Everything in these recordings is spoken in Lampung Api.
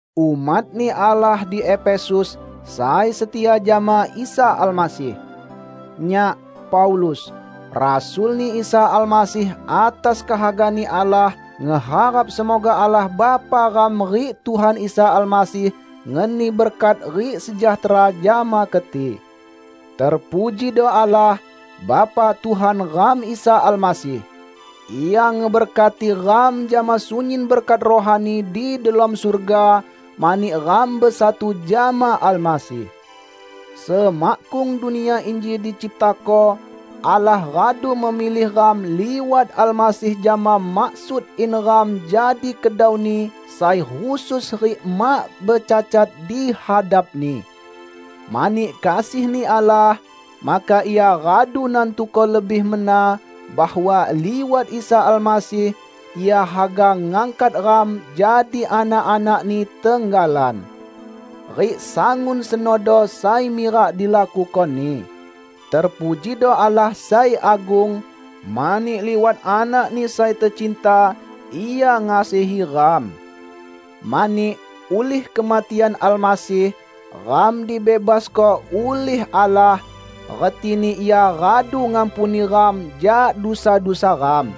Umat-Ni Allah di Efesus, sai setia jama Isa Almasih! Nyak, Paulus, rasul-Ni Isa Almasih atas kehaga-Ni Allah, ngeharap semoga Allah Bapa ram rik Tuhan Isa Almasih ngeni berkat rik sejahtera jama keti. Terpujido Allah, Bapa Tuhan ram Isa Almasih! Ia ngeberkati ram jama sunyin berkat rohani di delom surga, mani ram besatu jama Almasih. Semakkung dunia inji diciptako, Allah radu memilih ram liwat Almasih jama maksud in ram jadi kedau-Ni sai khusus rik mak becacat di hadap-Ni. Mani kasih-Ni Allah, maka Ia radu nantuko lebih mena bahwa liwat Isa Almasih, Ia haga ngangkat ram jadi anak-anak-Ni tenggalan. Rik sangun senodo sai mirak dilakuko-Ni. Terpujido Allah sai agung, mani liwat Anak-Ni sai tecinta Ia ngasihi ram. Mani, ulih kematian Almasih, ram dibebasko ulih Allah, retini Ia radu ngampuni ram jak dusa-dusa ram.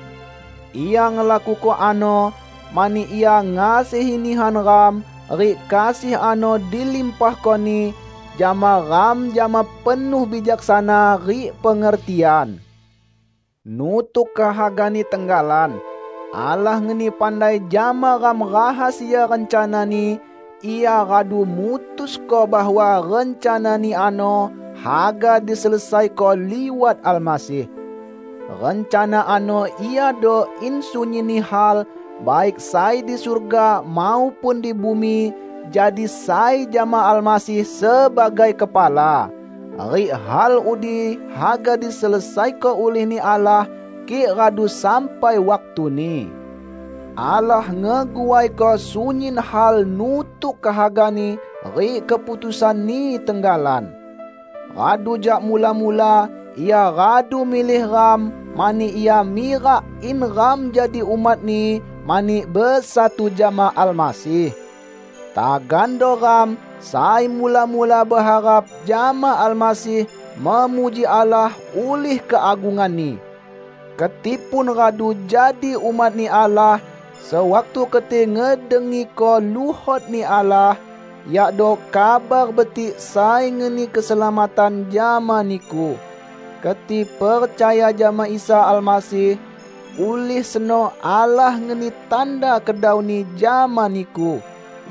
Ia ngelakuko ano mani Ia ngasihi nihan ram, rik kasih ano dilimpahko-Ni jama ram jama penuh bijaksana rik pengertian. Nutuk kehaga-Ni tenggalan, Allah ngeni pandai jama ram rahasia rencana-Ni; Ia radu mutusko bahwa rencana-Ni ano haga diselesaiko liwat Almasih. Rencana ano iado in sunyinni hal, baik sai di surga maupun di bumi, jadi sai jama Almasih sebagai kepala. Rik hal udi haga diselesaiko ulih-Ni Allah kik radu sampai waktuni. Allah ngeguaiko sunyin hal nutuk kehaga-Ni rik keputusan-Ni tenggalan. Radu jak mula-mula Ia radu milih ram mani Ia mirak in ram jadi umat-Ni mani besatu jama Almasih. Tagando ram, sai mula-mula beharap jama Almasih memuji Allah ulih keagunganni! Keti pun radu jadi umat-Ni Allah sewaktu keti ngedengiko luhot-Ni Allah, yakdo Kabar Betik sai ngeni keselamatan jama niku. Keti percaya jama Isa Almasih, ulih seno Allah ngeni tanda kedau-Ni jama niku,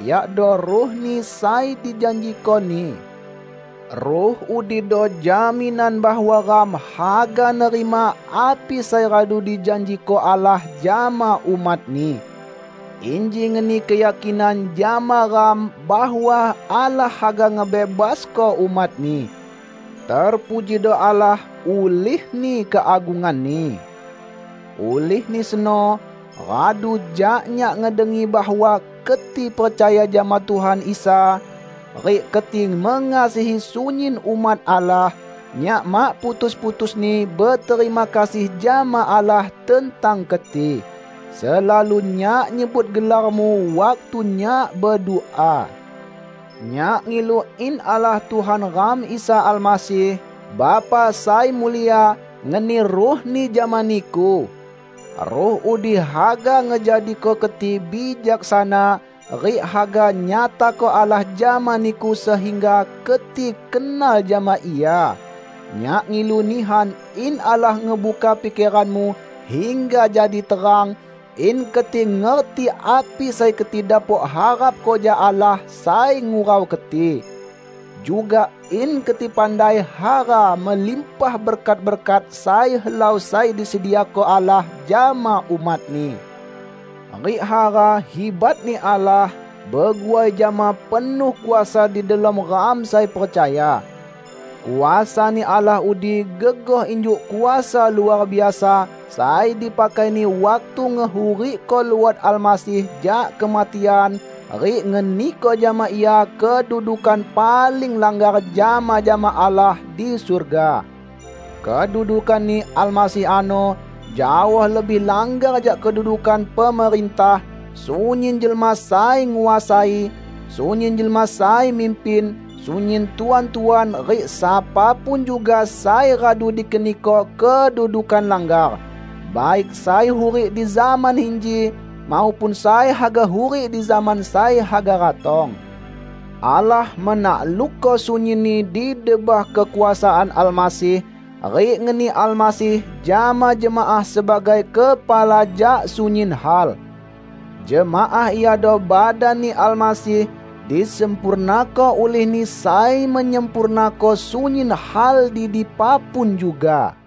yakdo Ruh-Ni sai dijanjiko-Ni. Ruh udido jaminan bahwa ram haga nerima api sai radu dijanjiko Allah jama umat-Ni. Inji ngeni keyakinan jama ram bahwa Allah haga ngebebasko umat-Ni. Terpujido Allah ulihni keagungan-Ni. Ulihni seno, radu jak nyak ngedengi bahwa keti percaya jama Tuhan Isa, rik keti mengasihi sunyin umat Allah; nyak mak putus-putusni beterima kasih jama Allah tentang keti. Selalu nyak nyebut gelarmu waktu nyak bedua. Nyak ngilu in Allah Tuhan ram Isa Almasih, Bapa sai mulia, ngeni Ruh-Ni jama niku. Ruh udi haga ngejadiko keti bijaksana, rik haga nyatako Allah jama niku sehingga keti kenal jama Ia. Nyak ngilu nihan in Allah ngebuka pikeranmu hingga jadi terang; in keti ngerti api sai keti dapok harapko jak Allah sai ngurau keti. Juga in keti pandai hara melimpah berkat-berkat sai helau sai disediako Allah jama umat-Ni; rik hara hibat-Ni Allah beguai jama penuh kuasa di delom ram sai percaya. Kuasa-Ni Allah udi gegoh injuk kuasa luar biasa sai dipakai-Ni waktu ngehurikko luot Almasih jak kematian rik ngeniko jama Ia kedudukan paling langgar jama-jama Allah di surga. Kedudukan-Ni Almasih ano jaoh lebih langgar jak kedudukan pemerintah, sunyin jelma sai nguasai, sunyin jelma sai mimpin, sunyin tuan-tuan rik sapa pun juga sai radu dikeniko kedudukan langgar; baik sai hurik di zaman inji maupun sai haga hurik di zaman sai haga ratong. Allah menaklukko sunyinni di debah kekuasaan Almasih, rik ngeni Almasih jama jemaah sebagai kepala jak sunyin hal. Jemaah iado badan-Ni Almasih, disempurnako ulih-Ni sai menyempurnako sunyin hal di dipa pun juga.